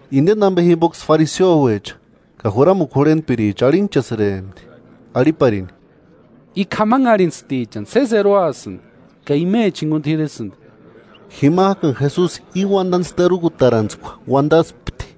Indeni ambe jimboksï fariseoecha ka juramukua jurhentpiricha arhinhchasïrempti, arhiparini: –I k'amanharhintstichani sési eroasïndi ka imecha jinguni t'iresïndi. Jimajkani Jesusi íni uandantskua terukutarantskua uandaspti: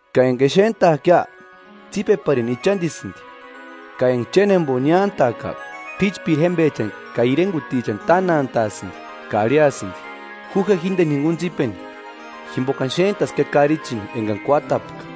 Ka enga exentajkia, tsípeparini ichandisïndi ka enga chénjembo niántajka, p'íchpiri jémbechani ka irengutichani tánantaasïndi ka arhiasïndi: ‘Ju je jíndeni jinguni tsípeni, jimbokani xéntaskia karichini engani kuátapka.’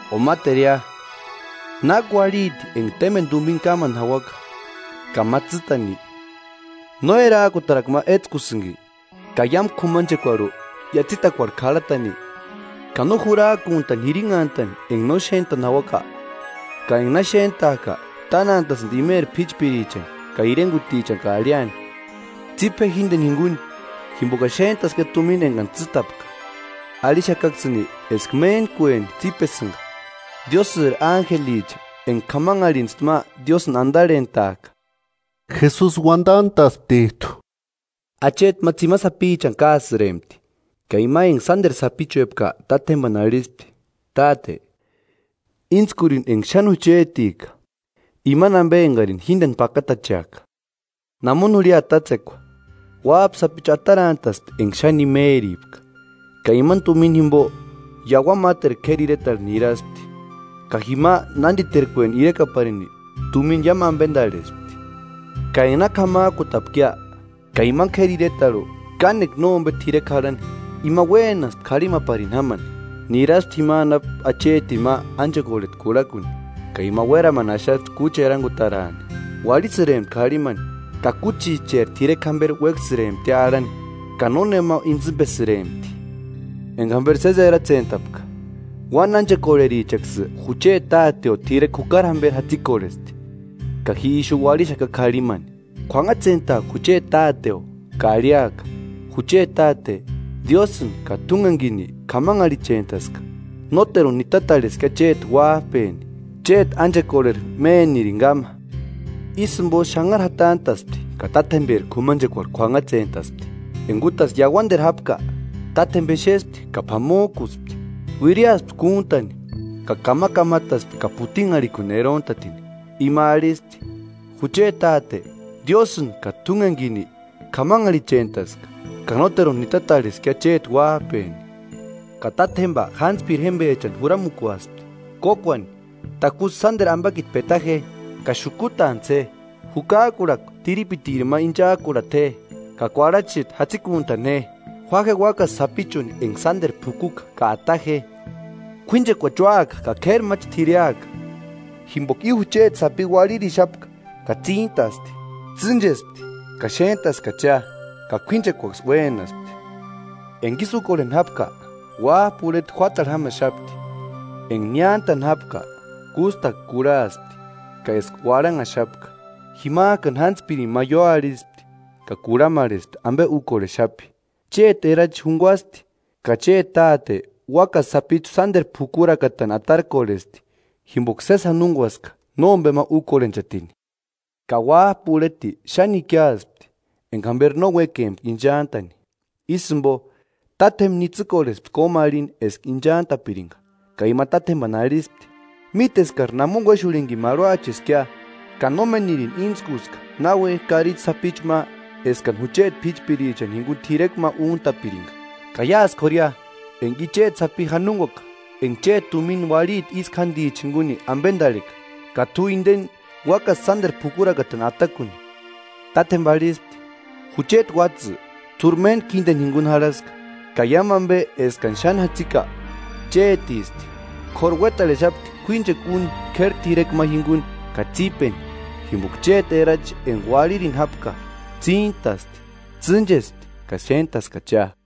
“O máteria: ¿Náki uarhiti enga témbeni tumina kámani jauaka ka ma tsîtani no erajkutarakua ma étskusïnki ka iámu k'umanchekuarhu iatsitakuarhu k'arhatani? ¿Ka no jurajkuntani jirinhantani enga no xéntani jauaka? Ka enga na xéntajka, tánantaasïndi imeri p'íchpirichani ka irengutichani ka arhiani: ‘Tsípe je jíndeni jinguni, jimbokani xéntaskiia tumina engani tsîtapka.’ Arhixakaksïni eskaksï méntkueni tsípesïnga Diósïri ánjelicha enga k'amanharhintsti ma Diósïni andarhentajka.” Jesusi uandantasptijtu: “Acheti ma tsimani sapichani kásïrempti, ka ima enga sánderu sapichuepka tátjembani arhispti: ‘Táte, íntskurini enga xáni juchetika, imani ambe engarini jíndeni pakatacheaka.’ Namoni jurhia tátsekua, uájpa sapichu atarantaspti enga xáni imeripka, ka imani tumina jimbo iauani máteru k'éri iretarhu niraspti, ka jima nánditerkueni irekaparini tumina iámu ambendarhespti. Ka enga na k'amajkutapkia, ka imani k'éri iretarhu kánekua nómbe t'irekua jarhani ima uénaspti k'arhimaparini jámani. Niraspti jima anapu achetini ma ánchekorheta kurhakuni, ka ima uéramani axaspti kúchi erangutaraani. Uarhisïrempti k'arhimani ka kúchicheri t'irekua jamberi uéksïremptia arhani, ka nónema intsïmbesïrempti. Enga jamberi sési eratsentapka: ‘¡Uáni ánchekorherichaksï jucheti táteo t'irekua jukari jamberi jatsikorhesti, ka ji ixu uarhixaka k'arhimani! K'uanhatsentaaka jucheti táteo ka arhiaka: Jucheti Táte, Diósïni ka t'úngenikini k'amanharhichentaska; nóteruni nitatarheska chéti uájpeni; chéti ánchekorheri ménirini káma.’ Ísï jimbo xanhari jatantaspti ka tátjemberi k'umanchekuarhu k'uanhatsentaspti.” “Enga útasï iauaniteru jápka, tátjemba exespti ka p'amojkuspti. Uiriaspti kúntani ka kamakamataspti ka putinharhikuni erontatini. Ima arhispti: ‘Jucheti Táte, Diósïni ka t'úngenikini k'amanharhichentaska; ka nóteruni nitatarheska chéti uájpeni.’ Ka tátjemba jántspiri jémbechani juramukuaspti: ‘Kókuani, takusï sánderu ambakiti peta je, ka xukutantsï je; jukajkurhakua tiripitiri ma inchajkurhata je, ka kuarhachijtu jatsikuntani je. Jua je úakasï sapichuni enga sánderu p'ukuka ka ata je. ¡K'uínchekuachi úaka ka k'éri máchi t'ireaka! Jimboka i jucheti sapi uarhirixapka ka tsíntasti; tsînchespti ka xéntaskachia.’ Ka k'uínchekuaksï uénaspti.” “Enga ísï úkorheni jápka, uájpa urheti juátarhu jámaxapti. Enga niántani jápka, kústakua kurhaspti ka eska uarhanhaxapka. Jimajkani jántspirini ma ióarhispti ka kurhamarhespti ambe úkorhexapi. ‘Chéti erachi junguasti ka chéti táte úakasï sapichu sánderu p'ukurakatani atarkorhesti, jimboka sési janonguaska nómbema úkorhenchatini.’ Ka uájpa urheti xáni ikiaspti enga jamberi no uékempka inchantani, ísï jimbo, tátjemba nitsïkorhespti kómarhini eska ichantapiringa. Ka ima tátjembani arhispti: ‘Míteskari namoni uéxurhinikini marhuacheskia, ka nómenirini íntskuska náuejki karichi sapichu ma eskani jucheti p'íchpirichani jinguni t'irekua ma úntapiringa. Ka iásï k'ória enga i chéti sapi janonguaka enga chéti tumina uarhiti ísku jándichani jinguni ambendarheka, ka t'u indeni úakasï sánderu p'ukurakatani atakuni.’ Tátjemba arhispti: ‘Jucheti uátsï, t'úri méntku jíndeni jinguni jarhaska, ka iámu ambe eskani xáni jatsika chétisti. K'óru uétarhexapti k'uíchekua úni k'éri t'irekua ma jinguni ka tsípeni, jimboka chéti erachi enga uarhirini jápka, tsíntasti; tsînchespti ka xéntaskachia.’”